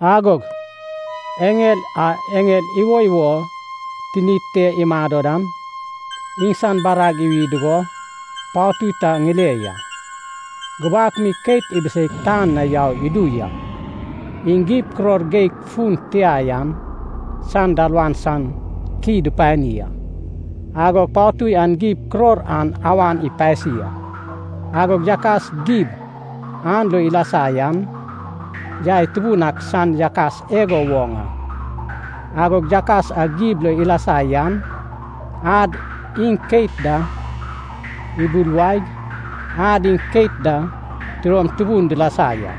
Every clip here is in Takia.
Agog eŋel a eŋel iwoiwo tinid te imado dan, iŋsan barag iwi dugo patui ta ŋile ya. Gubak mi keit ibiseig tan na yau idu ya. Iŋ gib kuror geig fun tia yan san dalawan san ki dupani a. Agog patui an gib kuror an awan ipasi a, agog yakas gib an lo ilasa yan, yai tubun ak san yakas igo woŋ a. Agod yakas a gib lo ilasa yan, ad iŋ keit da ibuluwaig ad iŋ keit da tidom tubun dilasa ya.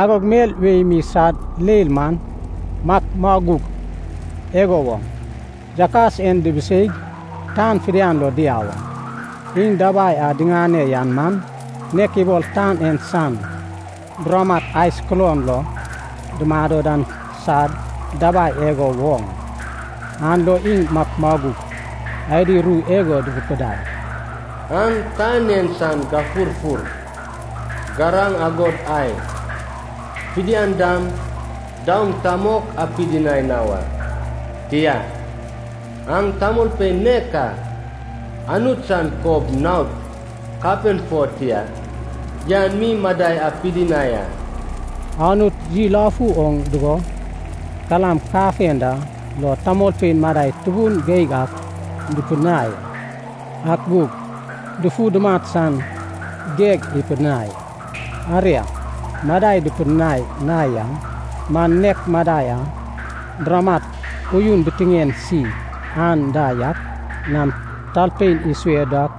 Agog mel wei mi sad leil man makmaguk igo woŋ, yakas en dibiseig tan fidian lo diau a. Iŋ dabai a diŋane yan man, nek ibol tan en san buramat ai sukulon lo dumado dan sad dabai igo woŋ a. An lo iŋ makmaguk adi ru igo durupidai, “Aŋ tan en san gufurfur, garaŋ agod ai fidian dam daoŋ ta mok apidinai na wa. Tia, aŋ tamolpein nek a Anut san kob naod kapen fo tia yan mi madai apidinai a.” Anut yilafu oŋ dugo kalam kafenda lo tamolpein madai tubun geig ak dupidinai a. Ak gug dufu dumat san geg ipidinai a. Aria, madai dupidinai na yan man, nek madai a buramat uyun bitiŋen si anda yak nam talpein isue dak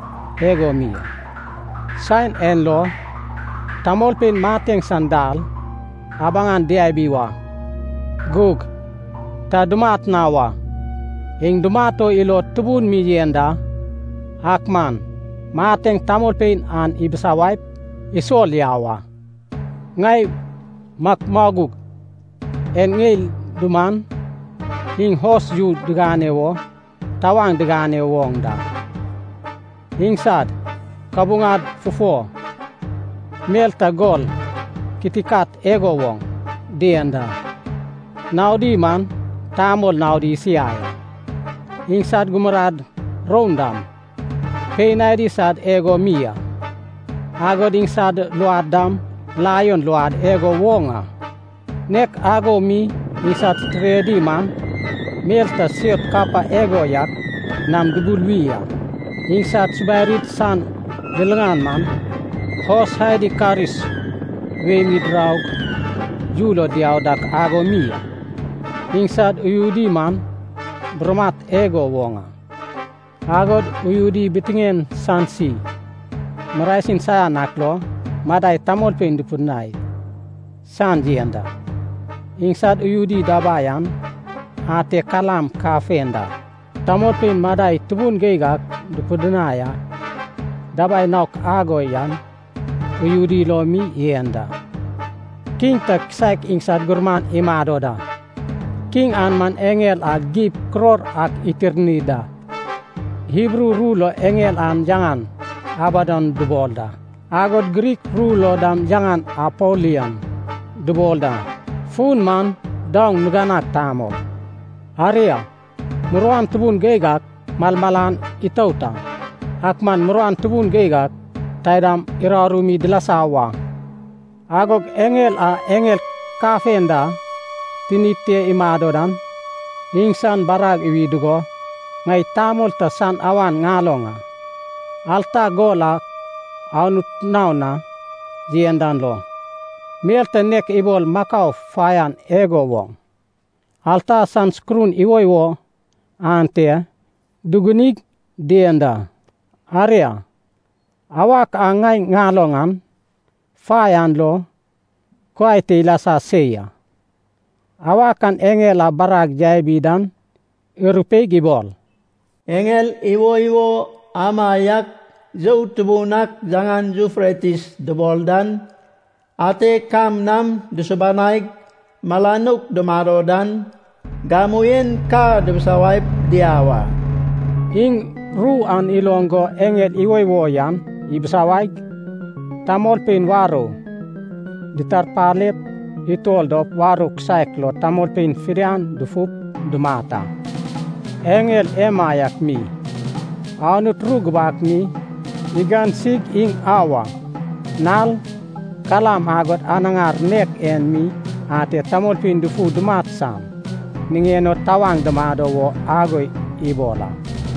igo mi a. Saen en lo, tamolpein mateŋ san dal abaŋan diabi wa, gug ta dumat na wa. Iŋ dumat o ilod tubun mi yen da, ak man mateŋ tamolpein an ibisawaip isol yau a. Ŋai makmaguk en ŋeil duman, iŋ hos yu digane wo tawaŋ digane woŋ da. Iŋsad kabuŋad fufo mel ta gol kitikat igo woŋ dien da. Naodi man tamol naod isiai a. Iŋsad gumurad roun dam, pein adi sad igo mi a. Agod iŋsad luod dam laion luodi igo woŋ a. Nek ago mi iŋsad titiredi man, mel ta siot kapa igo yak nam dubuluwi a. Iŋsad subarid san liliŋan man, hos adi karis wei mi diraug yu lo diau dak ago mi a. Iŋsad uyudi man buramat igo woŋ a, agod uyudi bitiŋen san si marasin saian ak lo madai tamolpein dupidinai san yen da. Iŋsad uyudi dabai an ate kalam kafenda tamolpein madai tubun geig ak dupidinai a. Dabai naok ago yan uyudi lo mi yen da. Kiŋ ta kisaek iŋsad gurman imado da. Kiŋ an man eŋel a gib kuror ak itirni da. Hibru ru lo eŋel an yaŋan Abadon dubol da, agod Grik ru lo dam yaŋan Apolion dubol da, fun man “Daoŋ Niganag Tamol.” Aria, muruan tubun geig ak malmalan itout a. Ak man muruan tubun geig ak taidam uraru mi dilasa wa. Agog eŋel a eŋel kafenda tinid te imado dan, iŋsan barag iwi dugo, ŋai tamol ta san awan ŋaloŋ a. Alta gol a Anut naon na yen dan lo, mel ta nek ibol makau faian igo woŋ, alta san sukurun iwoiwo ante dugunig dien da. Aria, awak a ŋai ŋaloŋ an fai an lo kuai te ilasa se ya. Awak an eŋel a barag yabi dan irupeig ibol, “Eŋel iwoiwo amaiak you tubun ak yaŋan Yufretis dubol dan, ate kam nam dusubanaig mala nouk dumado dan, gamu en ka bisawaip diau a.” Iŋ ru an iloŋ go eŋel iwoiwo yan ibisawaig, tamolpein warou ditarpalep utol dop warou kisaek lo tamolpein fidian dufup dumat a. Eŋel emaiak mi, Anut ru gubak mi igansig iŋ auwa, nal, kalam agod anaŋar nek en mi ate tamolpein dufu dumat san niŋen o tawaŋ dumado wo ago ibol a.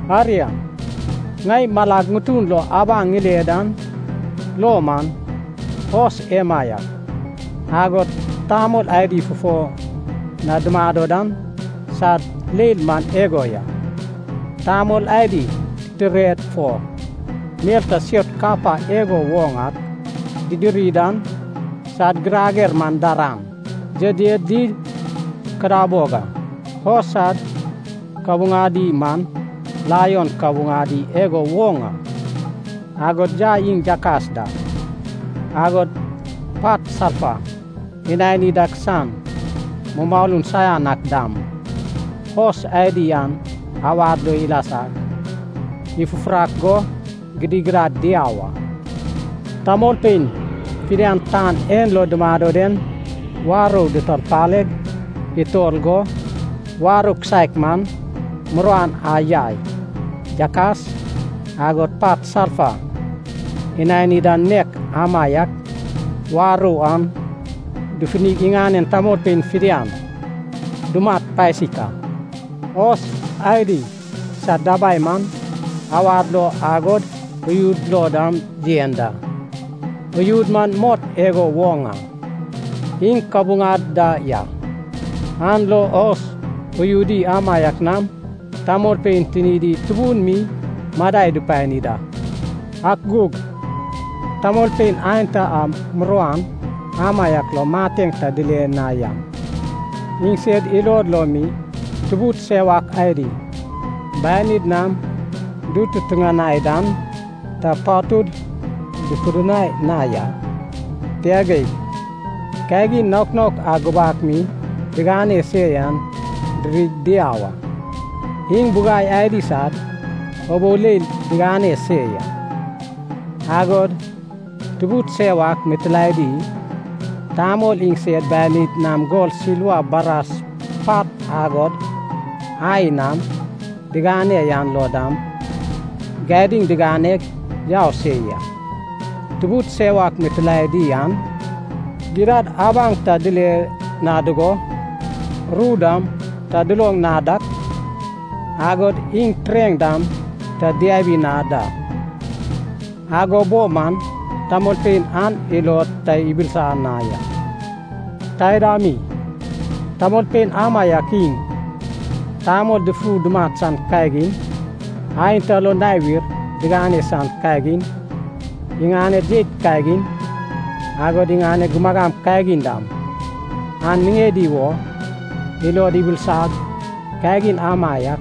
Aria, ŋai malag ŋutun lo abaŋ ŋile dan lo man, hos emaiak, agod tamol adi fufo na dumado dan sad leil man igo ya. Tamol adi titired fo mel ta siot kapa igo woŋ ak didiri dan, sad girager man daran, yedyed di kadabog a. Hos sad kabuŋadi man laion kabuŋadi igo woŋ a. Agod yai iŋ yakas da, agod pat salfa inani dak san mumalun saian ak dam, hos adi an awad lo ilasag ifufurak go gidigidad diau a. Tamolpein fidian tan en lo dumado den warou ditarpaleg utol go, warou kisaek man, muruan a yai, yakas, agod pat salfa inani dan nek amaiak warou an dufunig iŋanen tamolpein fidian dumat pasik a. Hos adi sad dabai man, awad lo agod uyud lo dam yen da. Uyudi man mot igo woŋ a, iŋ kabuŋad da ya. An lo hos uyudi amaiak nam tamolpein tinidi tubun mi madai dupani da. Ak gug tamolpein aenta a muruan amaiak lo mateŋ ta dile na yan, iŋsed ilod lo mi tubud sewak adi, banid nam dututuŋanai dan ta patud dupidinai na ya. Tia geig, kagin naok naok a gubak mi digane se yan dirig diau a. Iŋ bugai adi sad ubou leil digane se ya. Agod tubud sewak mitilaedi, tamol iŋsed banid nam gol silva bras pat agod ai nam digane yan lo dam gadiŋ diganeg yau se ya. Tubud sewak mitilaedi an gidad abaŋ ta dile na dugo, ru dam ta duloŋ na dak, agod iŋ tureŋ dam ta diabi na da. Ago bo man tamolpein an ilod ta ibilisa na ya. Taida mi, tamolpein amaiak iŋ, tamol dufu dumat san kagin, aenta lo nawir digane san kagin, iŋaned jeit kagin, agod iŋaned gumagam kagin dam, an niŋedi wo ilod ibilisag kagin amaiak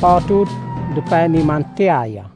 patud dupani man tia ya.